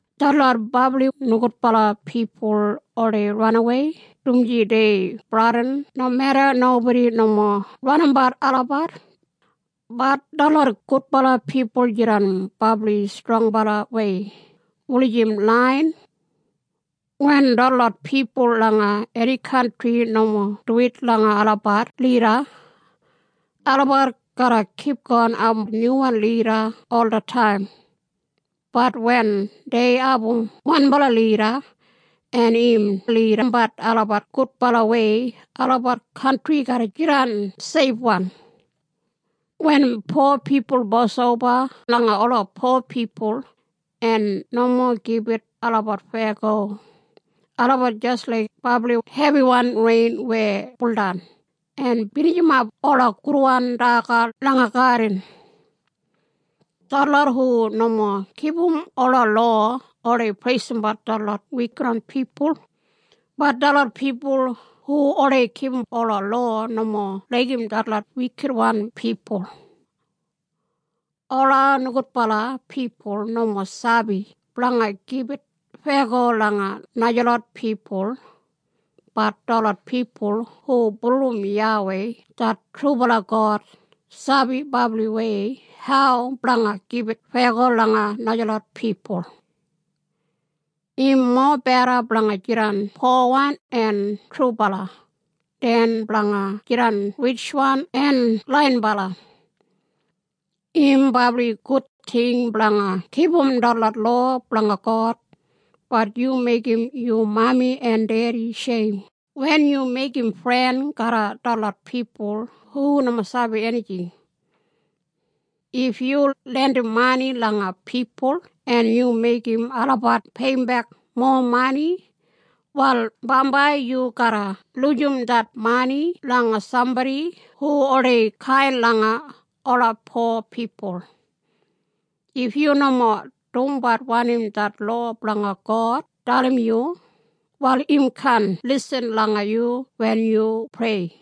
Detlot brabli nogudbala pipul oldei ranawei dumaji dei bradin nomeda nobodi nomo ranimbat olabat, bat detlot gudbala pipul jidan brabli strongbalawei, wulijim laiyan. Wen detlot pipul langa eni kantri nomo duwit langa olabat lida, olabat garra kipgon abum nyuwan lida olataim, bat wen dei abum wanbala lida en im lidimbat olabat gudbalawei, olabat kantri garra jidan seifwan. Wen po pipul bos oba langa ola po pipul en nomo gibit olabat feyago, olabat jis laik brabli hebiwan rein weya buldan en binijimap ola gudwan daga langa gadin. Detlot hu nomo kipum ola lowa oldei preisimbat detlot wikitwan pipul, bat detlot pipul hu oldei kipum ola lowa nomo laigim detlot wikitwan pipul. Ola nogudbala pipul nomo sabi blanga gibit feyago langa najalot pipul, bat detlot pipul hu bulurrum YAWEI det trubala God sabi brabliwei hau blanga gibit feyago langa najalot pipul. Im mobeda blanga jidan powan en trubala, den blanga jidan ritjwan en laiyinbala. Im brabli gud ting blanga kipum detlot lowa blanga God, bat yu meigim yu mami en dedi sheim wen yu meigim fren garram detlot pipul hu nomo sabi enijing. If yu lendim mani langa pipul en yu meigim olabat peiyimbek mowa mani, wal bambai yu garra lujim det mani langa sambodi hu oldei kain langa ola po pipul. If yu nomo dumbat wanim det lowa blanga God dalim yu, wal im kaan lisin langa yu wen yu prei.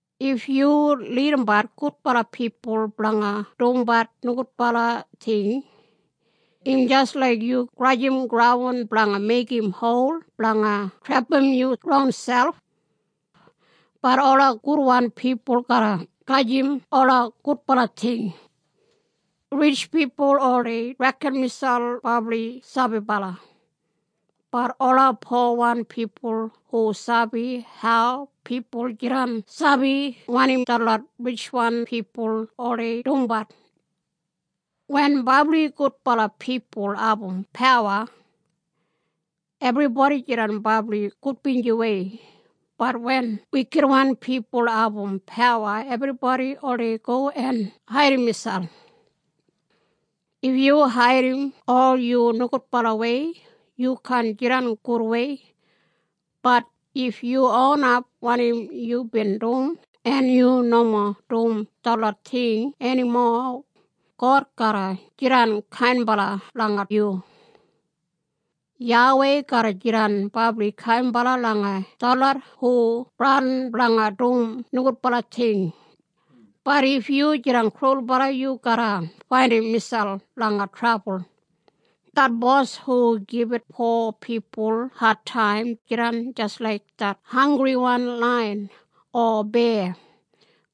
If yu lidimbat gudbala pipul blanga dumbat nogudbala ting, im jis laik yu grajim graun blanga meigim hol blanga trepam yu ronselp. Bat ola gudwan pipul garra gajim ola gudbala ting. Ritj pipul oldei reken miselp brabli sabibala, bat ola powan pipul hu sabi hau pipul jidan sabi wanim detlot ritjwan pipul oldei dumbat. Wen brabli gudbala pipul abum pawa ebribodi jidan brabli gudbinjiwei, bat wen wikitwan pipul abum pawa ebribodi oldei go en haidim miselp. If yu haidim ol yu nogudbalawei yu kaan jidan gudwei. Bat if yu onap wanim yubin dum en yu nomo dum detlot ting enimo, God garra jidan kainbala langa yu. YAWEI garra jidan brabli kainbala langa detlot hu bradin blanga dum nogudbala ting. Bat if yu jidan krulbala yu garra faindim miselp langa trabul. Det bos hu gibit po pipul adtaim jidan jis laik det hanggriwan laiyan o beya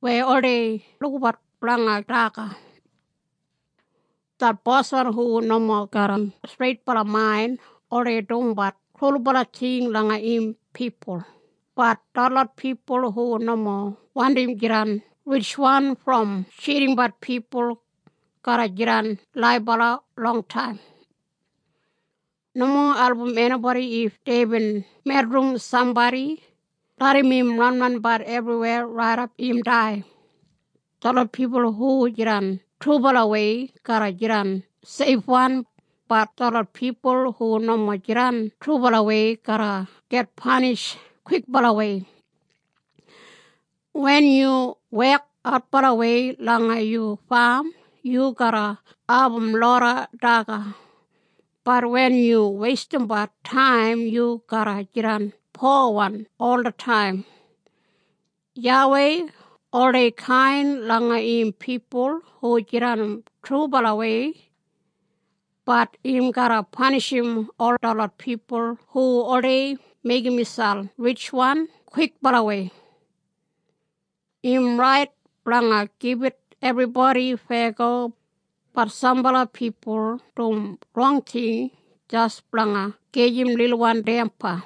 weya oldei lukabat blanga daga. Det boswan hu nomo garram streitbala main oldei dumbat krulbala ting langa im pipul, bat detlot pipul hu nomo wandim jidan ritjwan brom tjidimbat pipul garra jidan laibala longtaim. Nomo album enibodi if deibin medrim sambodi. Larram im ranranbat ebriweya raidap im dai. Detlot pipul hu jidan trubalawei garra jidan seifwan, bat detlot pipul hu nomo jidan trubalawei garra git panish kwikbalawei. Wen yu wek adbalawei langa yu fam yu garra abum loda daga, bat wen yu weistimbat taim yu garra jidan powan olataim. YAWEI oldei kain langa im pipul hu jidan trubalawei, bat im garra panishim ol detlot pipul hu oldei meigim miselp ritjwan kwikbalawei. Im rait blanga gibit ebribodi feyago, bat sambala pipul dum rong ting jis blanga gajim lilwan damba.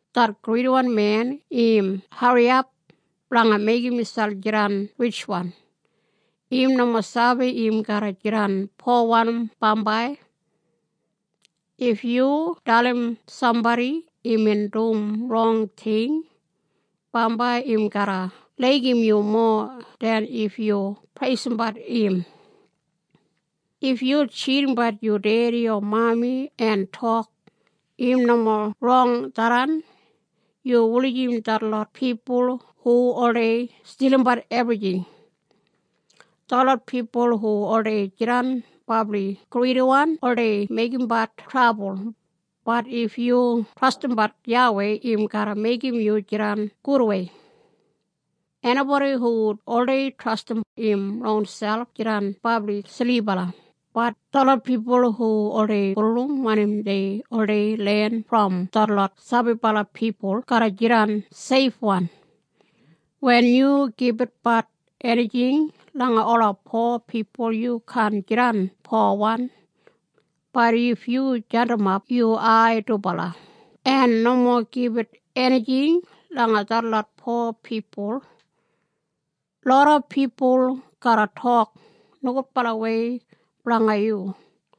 Det gridiwan men im hariyap blanga meigim miselp jidan ritjwan. Im nomo sabi im garra jidan powan bambai. If yu dalim sambodi imbin dum rong ting, bambai im garra laigim yu mowa den if yu preisimbat im. If yu tjidimbat yu dedi o mami en tok, “Im nomo rong tharran,” yu wulijim detlot pipul hu oldei stilimbat ebrijing. Detlot pipul hu oldei jidan brabli gridiwan oldei meigimbat trabul, bat if yu trastimbat YAWEI im garra meigim yu jidan gudwei. Enibodi hu oldei trastim im ronselp jidan brabli silibala, bat detlot pipul hu oldei bulurrum wanim dei oldei len brom detlot sabibala pipul garra jidan seifwan. Wen yu gibitbat enijing langa ola po pipul yu kaan jidan powan, bat if yu jadimap yu ai dubala en nomo gibit enijing langa detlot po pipul, loda pipul garra tok nogudbalawei blanga yu.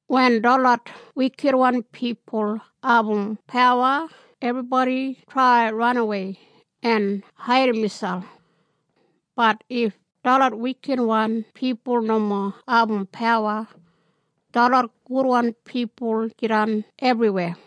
Wen detlot wikitwan pipul abum pawa ebribodi trai ranawei en haidim miselp, bat if detlot wikitwan pipul nomo abum pawa detlot gudwan pipul jidan ebriweya.